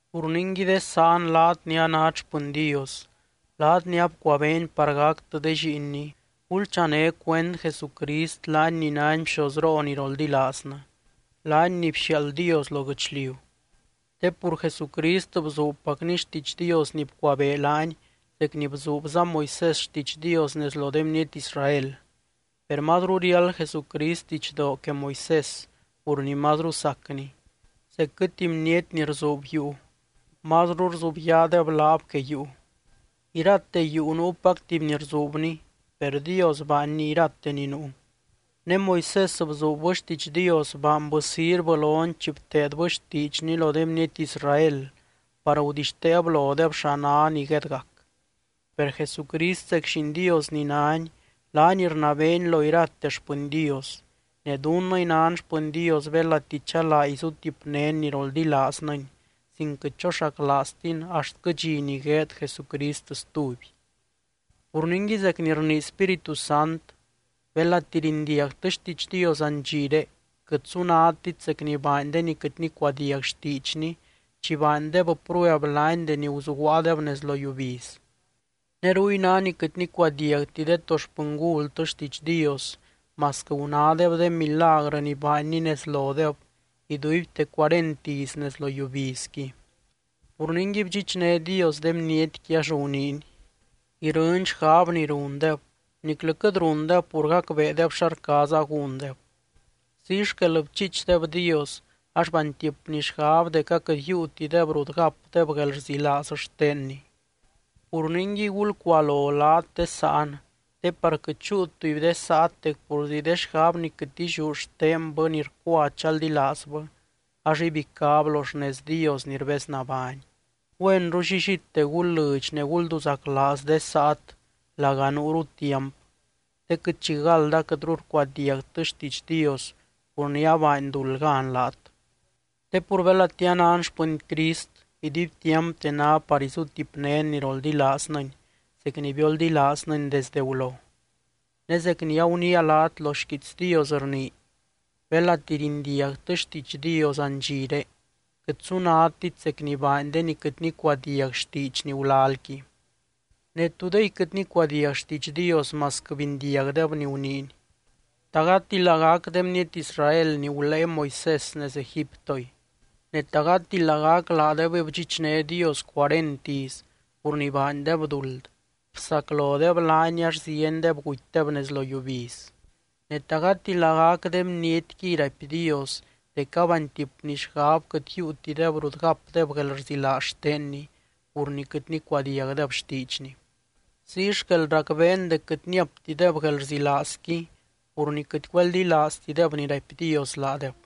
Pur ningui de sáan, laat ni anát xpɨny Dios, laat ni abcuabeeny par gactɨ de lliinny, gulchané cuend Jesucrist laany ni nány Bxozroo ni roldilaaznɨ, laany ni bxiaald Dios lo guɨchliu. Te pur Jesucrist bzuubpacny xtiidx Dios ni bcuabee laany zec ni bzuubza Moisés xtiidx Dios nez lo de bniety Israel. Per mazru riáld Jesucrist didxdoo que Moisés pur ni mazru sacny, zecquɨ tuby bniety ni rzuub yuu, mazru rzubyaadeb laab que yuu. Irate yuu nuupac tuby ni rzuubni, per Dios baanny irate ni nuu. Ne Moisés bzuubbɨ xtiidx Dios, baanbɨ sirvɨ lony chi bteedbɨ xtiidxny lo de bniety Israel par gudixteeb lodeb xa ná ni guedgac. Per Jesucrist zec Lliin Dios ni nány, laany rnabeeny lo irate xpɨny Dios. Ne dunnɨy nan xpɨny Dios, belati chalaa izutipnén ni roldilaaznɨny sin quɨt choxaclaaztin axtquɨ dxi ni gueed Jesucrist stuby. Pur ningui, zec ni rnii Spíritu Sant: Belati rindiagtɨ xtiidx Dios andxiré, quɨt sunadtit zec ni baany de ni quɨt nicuadiag xtiidxny chi baandeb prueb laany deni guzuguaadeb nez lo yiubiz. Ne ruy ná ni quɨt nicuadiagti de to xpɨngultɨ xtiidx Dios masquɨ gunádeb de milagrɨ ni baanny nez lodeb iduibte cuarent iz nez lo yiubizqui. Pur ningui, bdxichné Dios de bnietqui, ax guniiny: “Irɨny xgab ni rundeb niclɨ quɨt rundeb pur gacbeedeb xa rcaaza gúndeb.” Ziy xquel bchiichdeb Dios ax baantipny xgab dec aquɨt yiiutideb rut gapdeb guelrzilaaz xtenny. Pur ningui, gulcualo laat de sáan, te par quɨt chúu tuby de saat dec purzi de xgab ni quɨt illiú xtenbɨ ni rcua chaldilaazbɨ, ax ibicáb lo xnez Dios ni rbeznabány. Güenru llillite gul lɨdx ne gulduzaclaaz de saat laga nuuru tiamp, te quɨt chigald aquɨtru rcuadiagtɨ xtiidx Dios pur ni abaany duld gan laat. Te pur belati anan xpɨny Crist, iduibtiampte ná par izutipnén ni roldilaaznɨny zec ni bioldilaaznɨny desde gulo. Ne zec ni aguniia laat, lo xquiits Dios rnii: Belati rindiagtɨ xtiidx Dios andxiré, quɨt sunadtit zec ni baany de ni quɨt nicuadiag xtiidxny gulalqui. Ne, ¿tudey quɨt nicuadiag xtiidx Dios masquɨ bindiagdeb ni guniiny? ¿Ta gati lagac de bniety Israel ni gulée Moisés nez Egiptoy? Ne, ¿ta gati lagac laadebɨy bdxichné Dios cuarent iz pur ni baandeb duld, bsaclodeb laany ax ziendeb gutydeb nez lo yiubiz? Ne, ¿ta gati lagac de bnietquiy raipy Dios dec abaantipny xgab quɨt yiiutideb rut gapdeb guelrzilaaz xtenny, pur ni quɨt nicuadiagdeb xtiidxny? Ziy xquel racbeen dec quɨt niaptideb guelrzilaazqui pur ni quɨt güeldilaaztideb ni raipy Dios laadeb.